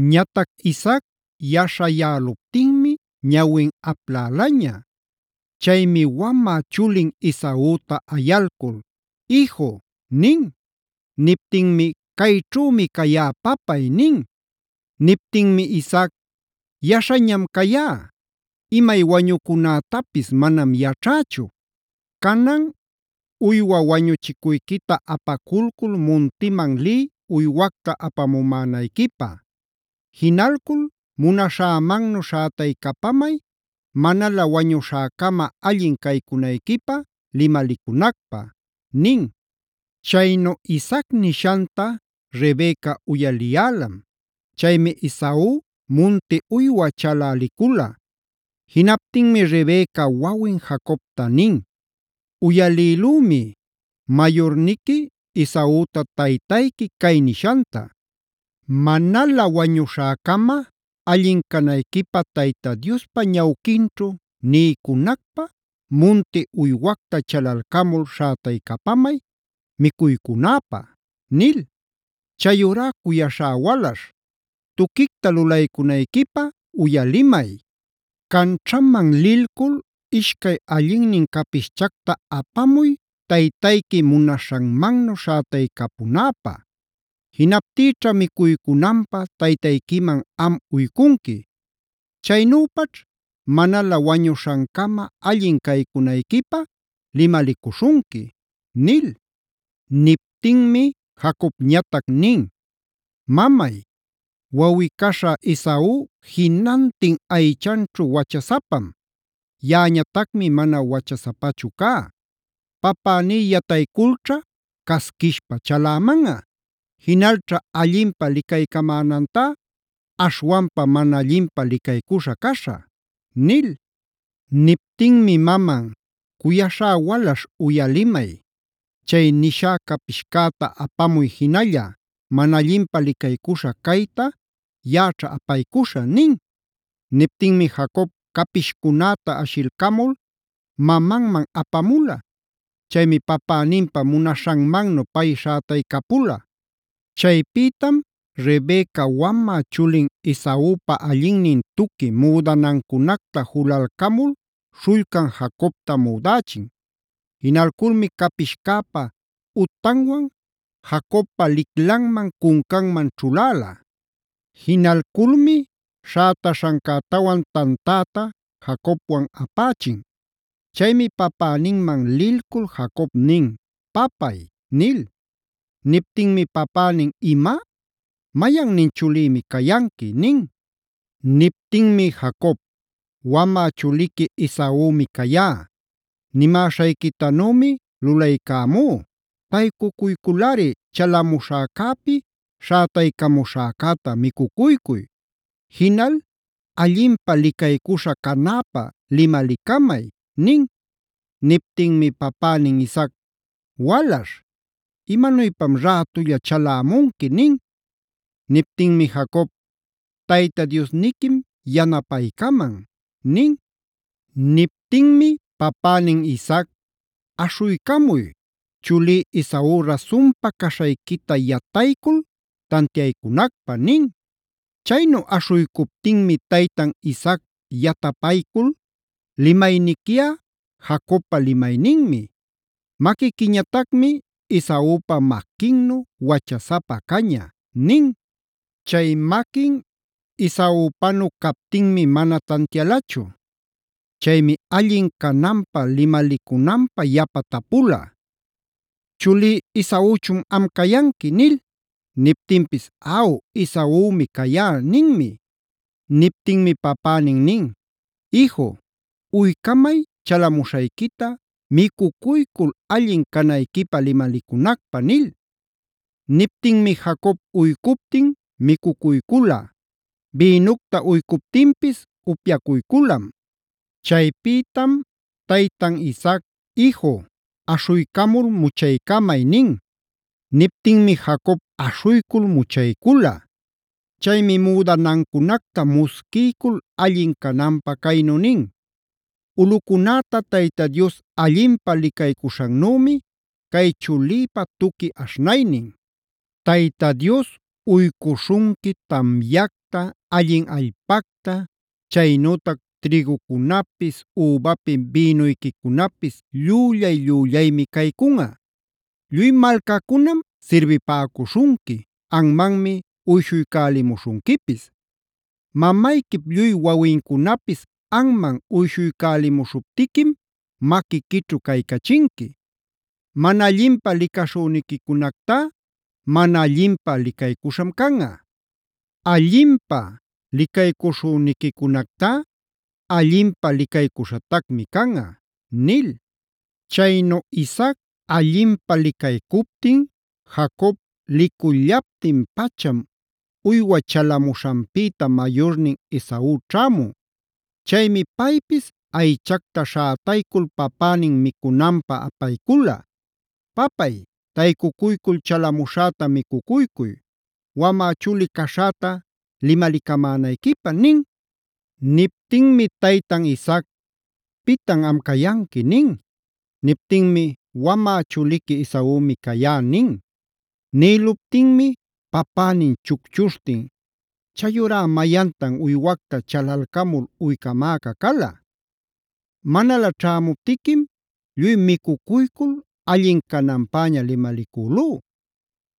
Ñatac Isaac yaśhayäluptinmi ñawin aplälaña. Chaymi wamä chulin Esauta ayalcul: “Iju” nin. Niptinmi: “Cayćhümi cayá papay” nin. Niptinmi Isaac: “Yaśhañam cayá, imay wañucunätapis manam yaćhacüchu. Canan uywa wañuchicuyquita apaculcul muntiman liy uywacta apamumänayquipä. Jinalcul munaśhämannu śhätaycapamay manalä wañuśhäcama allin caycunayquipä limalicunacpä” nin. Chaynu Isaac nishanta Rebeca uyaliyälam. Chaymi Esau munti uywa chalä licula. Jinaptinmi Rebeca wawin Jacobta nin: “Uyalïlümi mayurniqui Esauta taytayqui cay nishanta: ‘Manalä wañuśhäcama allin canayquipä Tayta Diospa ñawquinćhu niycunacpä, munti uywacta chalalcamul śhätaycapamay micuycunäpä’ nil. Chayurá cuyaśhä walaśh, tuquicta lulaycunayquipä uyalimay. Canćhaman lilcul ishcay allinnin capischacta apamuy taytayqui munaśhanmannu śhätaycapunäpä. Jinaptïćha micuycunanpä taytayquiman am uycunqui. Chaynüpaćh manalä wañuśhancama allin caycunayquipä limalicuśhunqui” nil. Niptinmi Jacobñatac nin: “Mamay, wawꞌi-caśha Esau jinantin aychanćhu wachasapam; yaꞌañatacmi mana wachasapachu cá. Papäní yatayculćha casquishpa chalämanꞌa. Jinalćha allinpä licaycamänantá aśhwanpa mana allinpä licaycuśha caśhä” nil. Niptinmi maman: “Cuyaśhá walaśh uyalimay, chay nishá capishcäta apamuy jinalla, mana allinpä licaycuśha cayta yaꞌaćha apaycuśhä” nin. Niptinmi Jacob capishcunäta ashilcamul mamanman apamula. Chaymi papäninpä munaśhanmannu pay śhätaycapula. Chaypïtam Rebeca wamä chulin Esaupa allinnin tuqui müdanancunacta julalcamul śhullcan Jacobta müdächin. Jinalculmi capischäpa utanwan Jacobpa liclanman, cuncanman ćhuläla. Jinalculmi śhätaśhancätawan tantäta Jacobwan apächin. Chaymi papäninman lilcul Jacob nin: “Papay” nil. Niptinmi papänin: “Ima, ¿mayannin chulïmi cayanqui?” nin. Niptinmi Jacob: “Wamä chuliqui Esaumi cayá. Nimäśhayquitanümi lulaycämú, taycuyculꞌari chalamuśhäcäpi śhätaycamuśhäcäta micucuycuy. Jinal allinpä licaycuśha canäpä limalicamay” nin. Niptinmi papänin Isaac: “Walaśh, ¿imanuypam rätulla chalämunqui?” nin. Niptinmi Jacob: “Tayta Diosniquim yanapaycaman” nin. Niptinmi papänin Isaac: “Aśhuycamuy, chulí Esau rasunpa caśhayquita yataycul tantiaycunacpä” nin. Chaynu aśhuycuptinmi taytan Isaac yatapaycul: “Limayniquiꞌa Jacobpa limayninmi; maquiquiñatacmi Esaupa maquinnu wachasapa caña” nin. Chay maquin Esaupanu captinmi mana tantialachu. Chaymi allin cananpä limalicunanpä yapa tapula: “Chulí Esauchun am cayanqui” nil. Niptinpis: “Aw, Esaumi cayá” ninmi. Niptinmi papänin nin: “Iju, uycamay chalamuśhayquita micuycul allin canayquipä limalicunacpä” nil. Niptinmi Jacob uycuptin micucuycula; bïnucta uycuptinpis upyacuyculam. Chaypïtam taytan Isaac: “Iju, aśhuycamul muchaycamay” nin. Niptinmi Jacob aśhuycul muchaycula. Chaymi müdanancunacta musquiycul allin cananpä caynu nin: “Ulꞌucunäta Tayta Dios allinpä licaycuśhannümi cay chulïpa tuqui aśhnaynin. Tayta Dios uycuśhunqui tamyacta, allin allpacta, chaynütac trïgucunapis, übapi bïnuyquicunapis llüllay-llüllaymia caycunꞌa. Lluy malcacunam sirbipäcuśhunqui, anmanmi uyśhuycälimuśhunquipis. Mamayquip lluy wawincunapis anman uyshuycälimuśhuptiquim maquiquićhu caycachinqui. Mana allinpä licaśhüniquicunactá mana allinpä licaycuśham canꞌa; Allinpä licaycuśhüniquicunactá allinpä licaycuśhatacmi canꞌa”b nil. Chaynu Isaac allinpä licaycuptin, Jacob licullaptin-pacham uywa chalamuśhanpïta mayurnin Esau ćhämun. Chaymi paypis aychacta śhätaycul papänin micunanpä apaycula: “Papay taycuycul chalamuśhäta micucuycuy wamä chuli caśhäta limalicamänayquipä” nin. Niptinmi taytan Isaac: “¿Pitan am cayanqui?” nin. Niptinmi: “Wamä chuliqui Esaumi cayá” nin. Nïluptinmi papänin chucchuśhtin: “¿Chayurá mayantan uywacta chalalcamul uycamäca cala? Manalä ćhämuptiquim lluy micucuycul, allin cananpäña limalicülú.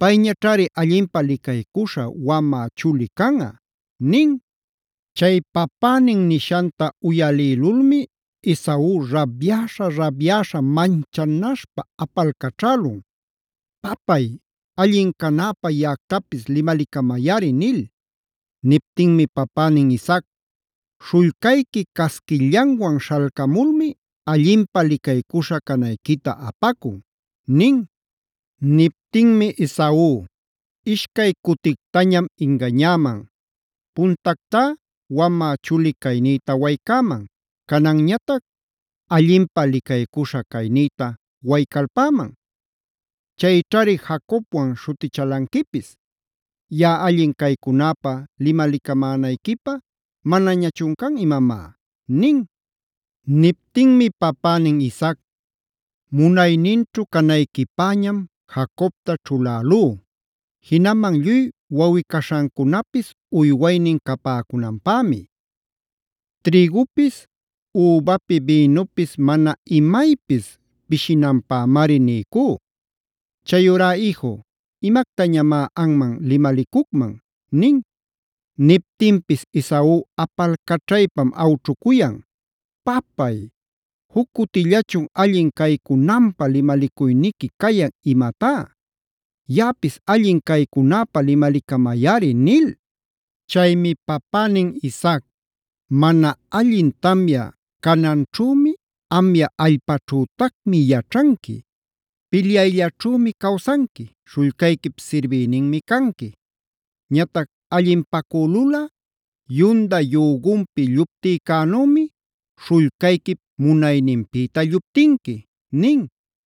Payñaćhari allinpä licaycuśha wamä chuli canꞌa” nin. Chay papänin nishanta uyalïlulmi Esau rabyäśha-rabyäśha manchanaśhpa apalcaćhälun: “¡Papay, allin canäpä yaꞌactapis limalicamayꞌari!” nil. Niptinmi papänin Isaac: “Śhullcayqui casquillanwan śhalcamulmi allinpä licaycuśha canayquita apacun” nin. Niptinmi Esau: “Ishcay cutictañam ingañäman. Puntactá wamä chuli caynïta waycäman. Cananñatac allinpä licaycuśha caynïta waycalpäman. ¡Chayćhari ‘Jacobwan’c śhutichälanquipis! ¿¡Yaꞌa allin caycunäpa limalicamänayquipä manañachun can imamá!?” nin. Niptinmi papänin Isaac: “Munayninćhu canayquipäñam Jacobta ćhulälú. Jinaman lluy wawꞌi-caśhancunapis uywaynin capäcunanpämi. Trïgupis, übapi bïnupis mana imaypis pishinanpämari niycú. Chayurá iju, ¿imactañamá anman limalicucman?” nin. Niptinpis Esau apalcaćhaypam awćhucuyan:d “¿¡Papay, juc cutillachun allin caycunanpä limalicuyniqui cayan imatá!? ¡Yaꞌapis allin caycunäpä limalicamayꞌari!” nil. Chaymi papänin Isaac: “Mana allin tamya cananćhümi, amya allpaćhütacmi yaćhanqui. Pilyayllaćhümi cawsanqui, śhullcayquip sirbïninmi canqui. Ñatac allinpacülulꞌa yunda yügunpi lluptïcänümi śhullcayquip munayninpïta lluptinqui”ef nin.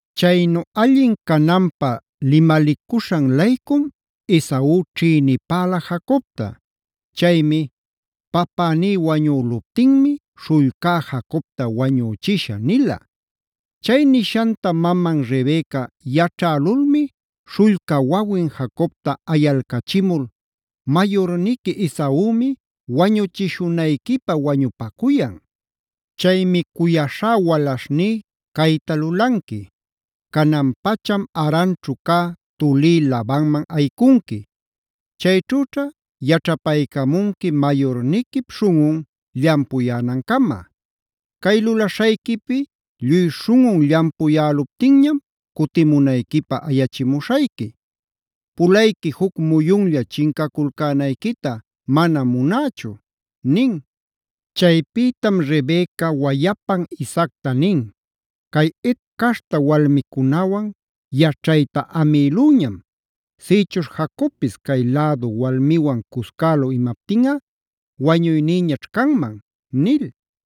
Chaynu allin cananpä limalicuśhan-laycum Esau ćhïnipäla Jacobta. Chaymi: “Papäní wañüluptinmi śhullcá Jacobta wañüchishä” nila. Chay nishanta maman Rebeca yaćhälulmi śhullca wawin Jacobta ayalcachimul: “Mayurniqui Esaumi wañuchishunayquipä wañupacuyan. Chaymi cuyaśhá walaśhní cayta lulanqui: canan-pacham Haranćhu cä tulí Labanman ayicunqui. Chayćhüćha yaćhapaycamunqui mayurniquip śhunꞌun llampuyänancama. Cay lulaśhayquipi lluy śhunꞌun llampuyäluptinñam cutimunayquipä ayachimuśhayqui. Pulayqui juc muyunlla chincaculcänayquita manam munächu” nin. Chaypïtam Rebeca wayapan Isaacta nin: “Cay Het caśhta walmicunäwan yaćhayta amïlüñam. Sïchuśh Jacobpis cay lädu walmiwan cuscälu imaptinꞌa ¡wañuynïñaćh canman!” nil.